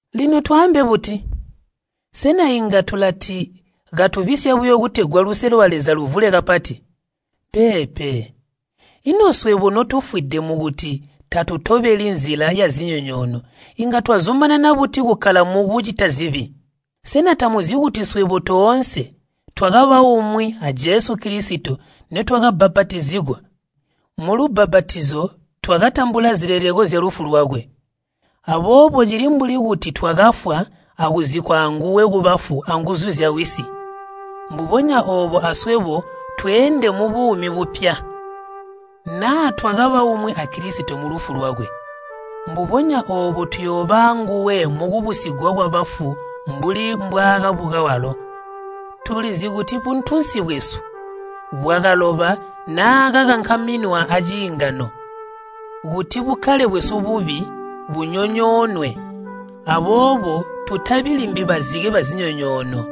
Lino twaambe buti? Sena inga tulati katubisya buyo kutegwa luse lwa Leza luvule kapati? Peepe! Ino swebo notufwide mukuti tatutobeli nzila yazinyonyoono inga twazumanana buti kukkala mukucita zibi? Sena tamuzi kuti swebo toonse twakaba umwi a Jesu Kilisito nitwakabbapatizigwa? Mulubbapatizo twakatambula zileleko zyalufu lwakwe. Aboobo cili mbuli kuti twakafwa akuzikkwa anguwe kubafu anguzu zyawisi, mbubonya oobo aswebo tweende mubuumi bupya. Naa twakaba umwi a Kilisito mulufu lwakwe, mbubonya oobo tuyooba anguwe mukubusigwa kwabafu mbuli mbwaakabuka walo. Tulizi kuti buntunsi bwesu bwakaloba naakakankaminwa aciingano kuti bukkale bwesu bubi bunyonyoonwe aboobo tutabi limbi bazike bazinyonyoono.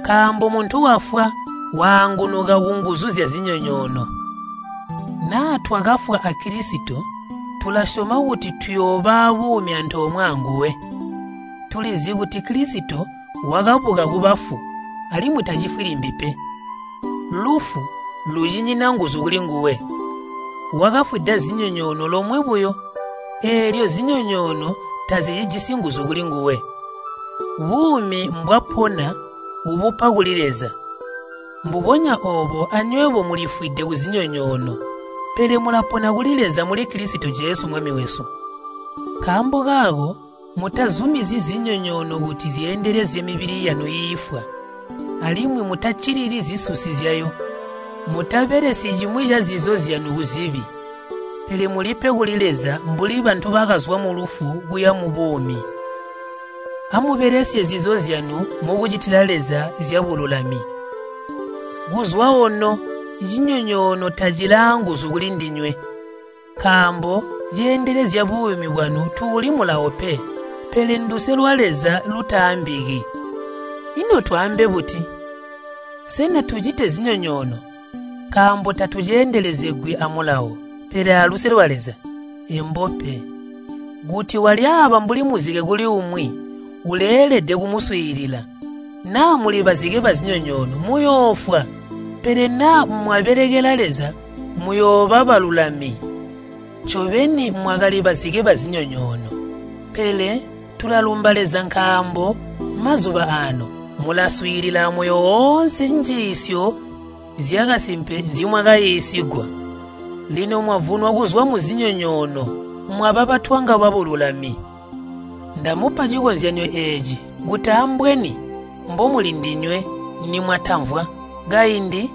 Nkaambo muntu wafwa, waangunuka kunguzu zyazinyonyoono. Naa twakafwa a Kilisito tulasyoma kuti tuyooba abuumi antoomwe anguwe. Tulizi kuti Kilisito wakabuka kubafu alimwi tacifwi limbi pe. Lufu lucinyina nguzu kulinguwe. Wakafwida zinyonyoono lomwe buyo, eelyo zinyonyoono tazicijisi nguzu kulinguwe. Buumi mbwapona ubupa kuli Leza. Mbubonya oobo anywebo mulifwide kuzinyonyoono, pele mulapona kuli Leza muli Kilisito Jesu Mwami wesu. Nkaambo kaako mutazumizyi zinyonyoono kuti zyeendelezye mibili yanu iifwa, alimwi mutaccilili zisusi zyayo. Mutabelesyi cimwi cazizo zyanu kuzibi. Pele mulipe kuli Leza mbuli bantu bakazwa mulufu kuya mubuumi. Amubelesye zizo zyanu mukucitila Leza zyabululami. Kuzwa ono cinyonyoono tacili aanguzu kulindinywe, nkaambo ceendelezya buumi bwanu tuuli Mulawo pe, pele nduse lwa Leza lutaambiki. Ino twaambe buti? Sena tucite zinyonyoono, nkaambo tatuceendelezegwi a Mulawo pele aluse lwa Leza? Embo pe! Kuti walyaaba mbuli muzike kuli umwi, uleelede kumuswiilila. Naa muli bazike bazinyonyoono muyoofwa, pele naa mwabelekela Leza muyooba balulami. Ncobeni mwakali bazike bazinyonyoono, pele tulalumba Leza nkaambo mazuba aano mulaswiilila amoyo oonse njiisyo zyakasimpe nzimwakaiisigwa. Lino mwavunwa kuzwa muzinyonyoono mwaba batwanga babululami. Ndamupa cikozyanyo eeci kuti ambweni mbomuli ndinywe nimwatamvwa. Kaindi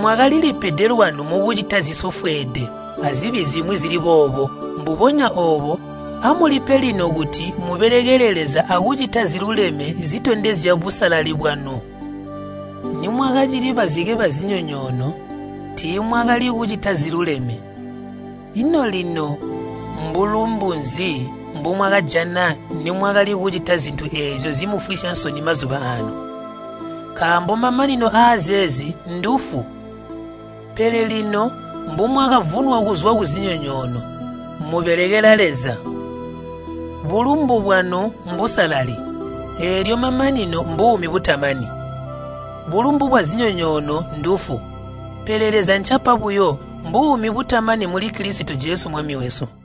mwakalilipede lwanu mukucita zisofweede azibi zimwi zili boobo. Mbubonya oobo amulipe lino kuti mubelekele Leza akucita ziluleme zitondezya busalali bwanu. Nimwakacili bazike bazinyonyoono, tiimwakali kucita ziluleme. Ino lino mbulumbu nzi mbomwakajana nimwakali kucita zintu eezyo zimufwisya nsoni mazuba aano? Nkaambo mamanino aazeezi ndufu. Pele lino mbumwakavunwa kuzwa kuzinyonyoono, mubelekela Leza. Bulumbu bwanu mbusalali, eelyo mamanino mbuumi butamani. Bulumbu bwazinyonyoono ndufu, pele Leza ncapa buyo mbuumi butamani muli Kilisito Jesu Mwami wesu.